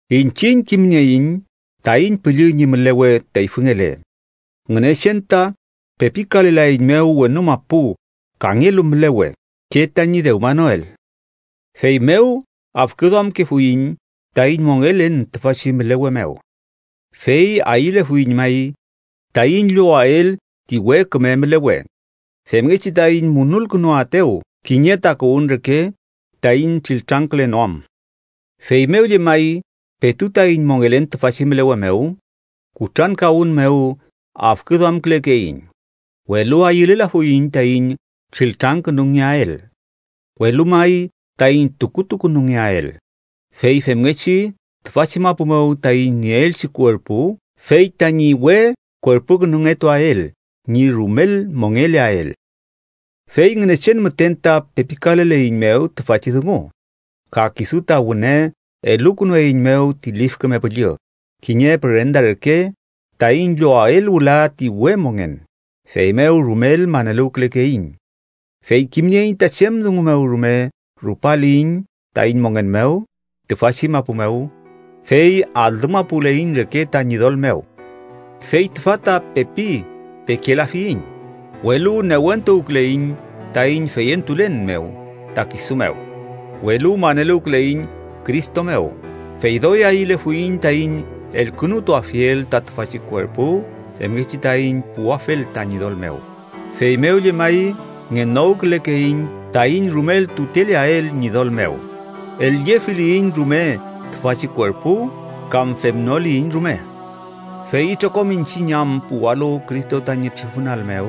Iñchiñ kimnieiñ taiñ püllü ñi mülewe teyfüngele, Ngünechen ta pepikalelaeiñmew wenu mapu kangelu mülewe che tañi dewmanoel. Feymew afküduamkefuiñ taiñ mongelen tüfachi mülewe mew, fey ayülefuiñ may taiñ llowael ti we küme mülewe, femngechi taiñ munulkünuaetew kiñe takuwün reke taiñ triltrangkülenoam. Feymew llemay petu taiñ mongelen tüfachi mülewe mew kutrankawün mew afküduamkülekeiñ, welu ayülelafuiñ taiñ triltrangkünungeael, welu may taiñ tukutukünungeael, fey femngechi tüfachi mapu mew taiñ nieelchi kuerpu fey tañi we kuerpukünungetuael ñi rumel mongeleael. Fey Ngünechen müten ta pepikaleleiñmew tüfachi dungu, ka kisu ta wüne elukünueiñmew ti Lif Küme Püllü kiñe pürenda reke, taiñ llowael wüla ti we mongen. Feymew rumel maneluwkülekeiñ. Fey kimnieiñ ta chem dungu mew rume rupaliyiñ taiñ mongen mew tüfachi mapu mew, fey alümapuleiñ reke ta Ñidol mew. Fey tüfa ta pepi pekelafiyiñ, welu newentuwküleiñ taiñ feyentulen mew ta kisu mew. Welu maneluwküleiñ Cristo mew, fey doy ayülefuiñ taiñ elkünutuafiel ta tüfachi kuerpu femngechi taiñ puwafel ta Ñidol mew. Feymew llemay ngenokülekeiñ taiñ rumel tuteleael Ñidol mew, el-llefiliyiñ rume tüfachi kuerpu, kam femnoliyiñ rume. Fey itrokom iñchiñ am puwalu Cristo tañi tribunal mew,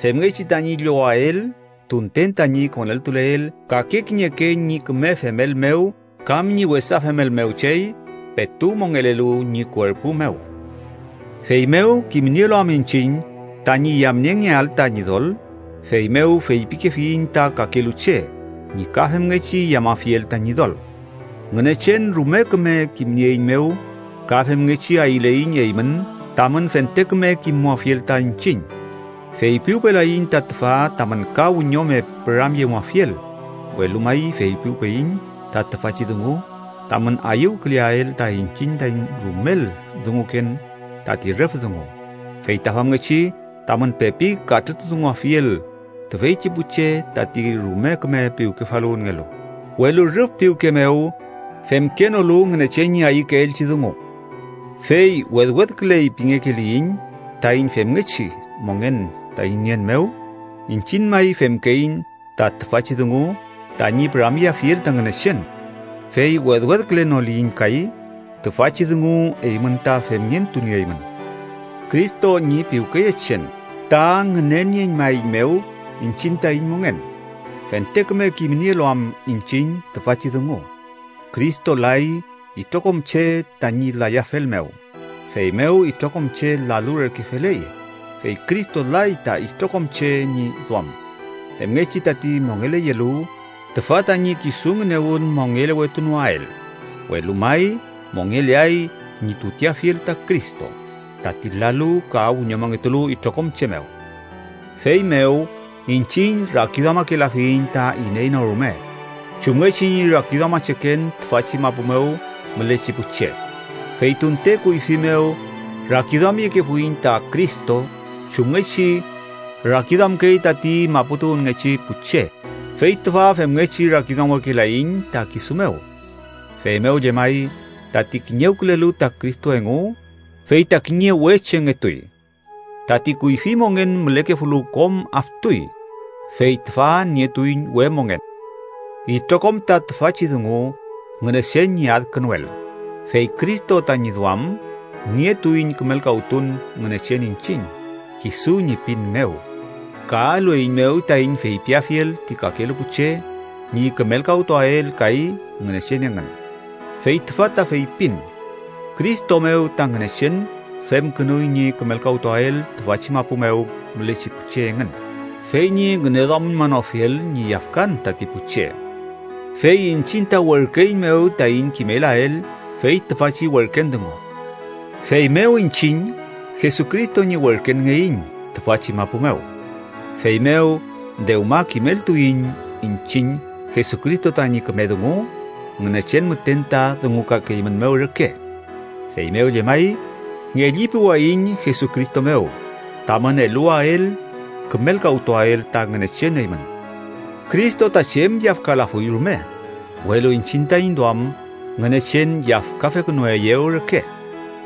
femngechi tañi llowael tunten tañi koneltuleel kake kiñeke ñi küme femel mew kam ñi wesa femel mew chey petu mongelelu ñi kuerpu mew. Feymew kimnielu am iñchiñ tañi yamniengeael ta Ñidol, feymew feypikefiyiñ ta kakelu che ñi ka femngechi yamafiel ta Ñidol. Ngünechen rume küme kimnieeiñmew ka femngechi ayüleiñ eymün tamün fente küme kimmuafiel ta iñchiñ. Feypiwpelayiñ ta tüfa tamün ka wiñome püramyemuafiel, welu may feypiwpeyiñ ta tüfachi dungu tamün ayüwküleael ta iñchiñ taiñ rumel dunguken tati rüf dungu. Fey ta famngechi tamün pepi katrütudunguafiel tüfeychi pu che tati rume küme piwkefaluwünngelu, welu rüf piwke mew femkenolu Ngünechen ñi ayükeelchi dungu. Fey wedwedküley pingekeliyiñ taiñ femngechi mongen taiñ nien mew, iñchiñ may femkeiñ ta tüfachi dungu tañi püramyeafiel ta Ngünechen. Fey wedwedkülenoliyiñ kay, tüfachi dungu eymün ta femngentunieymün. Cristo ñi piwkeyechen ta ngünenieñmaeiñmew iñchiñ taiñ mongen, fente küme kimnielu am iñchiñ tüfachi dungu: Cristo lay itrokom che tañi layafel mew, feymew itrokom che lalu reke feley. Fey Cristo lay ta itrokom che ñi duam, femngechi tati mongeleyelu tüfa tañi kisu ngünewün mongelewetunoael, welu may mongeleay ñi tuteafiel ta Cristo, tati lalu ka wiñomongetulu itrokom che mew. Feymew, iñchiñ rakiduamakelafiyiñ ta iney no rume chumngechi ñi rakiduamacheken tüfachi mapu mew mülechi pu che. Fey tunte kuyfi mew rakiduamyekefuiñ ta Cristo chumngechi rakiduamkey tati mapu tuwünngechi pu che, fey tüfa femngechi rakiduamwekelaiñ ta kisu mew. Feymew llemay, tati kiñewkülelu ta Cristo engu, fey ta kiñe we chengetuy. Tati kuyfi mongen mülekefulu kom aftuy, fey tüfa nietuiñ we mongen. Itrokom ta tüfachi dungu Ngünechen ñi adkünuel, fey Cristo tañi duam nietuiñ kümelkawtun Ngünechen iñchiñ kisu ñi pin mew, ka elueiñmew taiñ feypiafiel ti kakelu pu che ñi kümelkawtuael kay Ngünechen engün. Fey tüfa ta feypin: Cristo mew ta Ngünechen femkünuy ñi kümelkawtuael tüfachi mapu mew mülechi pu che engün, fey ñi ngüneduamüñmanofiel ñi yafkan tati pu che. Fey iñchiñ ta werküeiñmew taiñ kimelael fey tüfachi werken dungu. Feymew iñchiñ Jesucristo ñi werkenngeiñ tüfachi mapu mew, feymew dewma kimeltuiñ iñchiñ Jesucristo tañi küme dungu Ngünechen müten ta dungukakeeymünmew reke. Feymew llemay, ngellipuwayiñ Jesucristo mew tamün eluwael kümelkawtuael ta Ngünechen eymün. Cristo ta chem yafkalafuy rume, welu iñchiñ taiñ duam Ngünechen yafkafekünueyew reke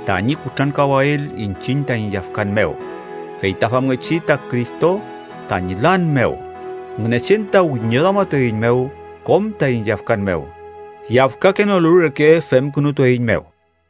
tañi kutrankawael iñchiñ taiñ yafkan mew, feyta famngechi ta Cristo tañi lan mew, Ngünechen ta wiñoduamatueiñmew kom taiñ yafkan mew. Yafkakenolu reke femkünutueiñmew.